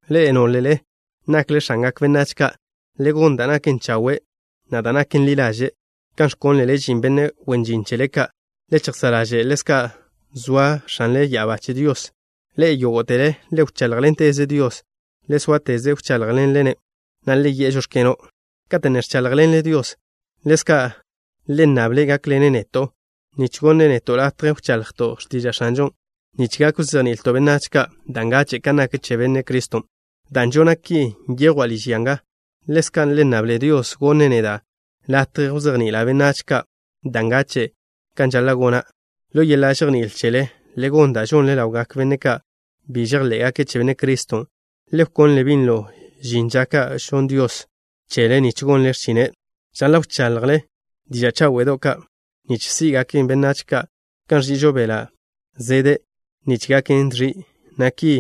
Ḻe'e, nólele nakle x̱angak benách ka', le gon da' naken chawe', na' da' naken ḻi ḻaže', kan ẕkónlele žin benne' wen žin chele ka'. Le chejsá' ḻaže' ḻezka' zoa X̱anle ya'abá che Dios. Ḻe'e, yógo'tele, le wcháḻjḻenteze Dios. Le sóateze wcháḻjḻenle-ne', na' le yi'e: “Žóx̱keno'.” Kate' ne ẕcháḻjḻenle Dios, ḻezka' le nnable' gákḻene' neto', nich wneẕjwe' neto' latje wchaḻjto' x̱tiža' X̱anžon', nich gak wzejni'ilto' benách ka' da' ngache' kan nak che Benne' Criston'. Dan' žona' ki nyejwa' liž ya nga. Ḻezka' le nnable Dios wneẕjwe' neda' latje wzejni'ila' benách ka' da' ngachen' kan žaḻa' gona'. Ḻo yeḻa' žejní'il chele, le gon da' žonle ḻawgak benne' ka' bi žejḻé'gake' che Benne' Criston'. Le wkonle binlo žin ža ka' gonn Dios chele nich gonle x̱chine'. Žaḻa' wchaḻjle diža' cháwe'do' ka' nich sí'gaken benách ka', kan ẕži'ižo beḻa' zede' nich gaken dẕi', na' ki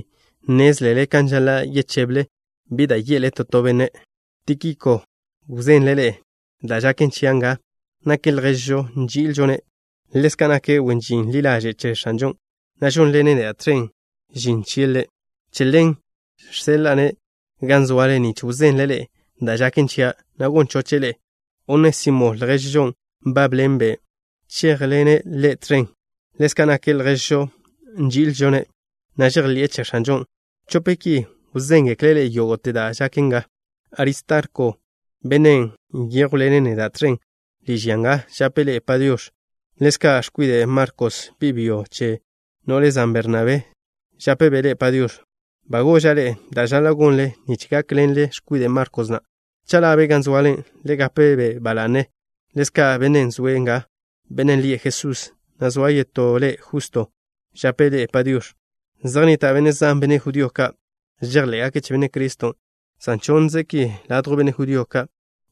nnézlele kan žaḻa' yecheble, bi da' ye'le to to benne'. Tíkiko wzenle' ḻe'e da' žaken chia' nga. Nake' lježžo nži'ilžo-ne'. Ḻezka' nake' wen žin ḻi ḻaže' che X̱anžon', na' žónḻene' neda' tẕen žin chie' Ḻe'. Che ḻen žseḻa'a-ne' gan zoale, nich wzenle' ḻe'e da' žaken chia', na' gon choche' ḻe'e. Onésimo, lježžon' nbábḻene' ḻe'e chéjḻene' ḻe' tẕen. Ḻezka' nake' lježžo nži'ilžo-ne', na' žejḻi'e che X̱anžon'. Chope' ki wzéngekle' ḻe'e yógo'te da' žaken nga. Aristarko, benne' nyéjwḻene' neda' tẕen liž ya nga žape' ḻe'e “Padiox̱.” Ḻezka' x̱kwide' Markos, bi' byo che no'le zan Bernabé, žápebe' ḻe'e “Padiox̱.” Ba goža' ḻe'e da' žaḻa' gonle nich gákḻenle x̱kwide' Markos na'. Cha' ḻa'be' gan zoale, le gape-be' ba la'ne. Ḻezka' bennen' zoe' nga, bennen' lie' Jesús, na' zoa yetó le' Justo, žape' ḻe'e “Padiox̱.” Zej nnita' benne' zan, benne' judío ka', žejḻé'gake' che Benne' Criston', san chonnze' ki ladjw benne' judío ka'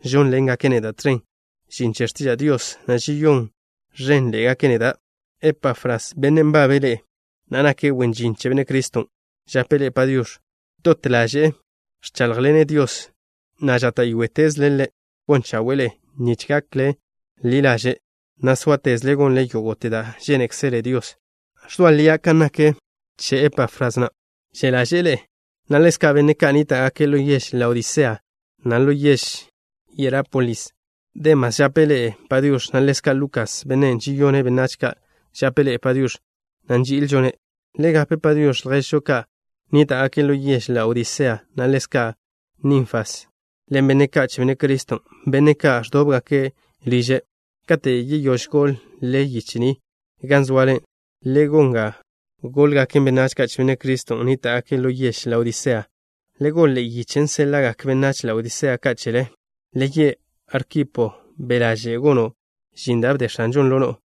žónḻengake' neda' tẕen žin che x̱tiža' Dios, na' žeyón ẕénḻe'egake' neda'. Epafras, bennen' nbabe' ḻe'e, na' nake' wen žin che Benne' Criston', žape' ḻe'e “Padiox̱.” Dot ḻaže'e ẕcháḻjḻene' Dios, na' žáta'yoetezle' Ḻe' gon chawe'e ḻe'e nich gakle ḻi ḻaže', na' sóatezle gonle yógo'te da' žénekzele Dios. Ẕzoa lia' kan nak che Epafras na', že' ḻaže'e ḻe'e, na' ḻezka' benne' ka' nníta'gake' ḻo yež Laodisea, na' ḻo yež Hierápolis. Demas žape' ḻe'e “Padiox̱” na' ḻezka' Lukas, bennen' žeyone' benách ka', žape' ḻe'e “Padiox̱” na' nži'ilžo-ne'. Le gape “Padiox̱” lježžo ka' nníta'gake' ḻo yež Laodisea, na' ḻezka' Ninfas ḻen benne' ka' che Benne' Criston', benne' ka' ẕdóbgake' liže'. Kate' yeyóž goḻ-le yiche ni gan zoale, le gon ga góḻgaken benách ka' che Benne' Criston' nníta'gake' lo yež Laodisea. Le goḻ ḻe'e yichen' séḻa'gak benách Laodisea ka' chele. Le ye' Arkipo: “Be' ḻaže' gono' žin da' bde X̱anžon' ḻo no'o.”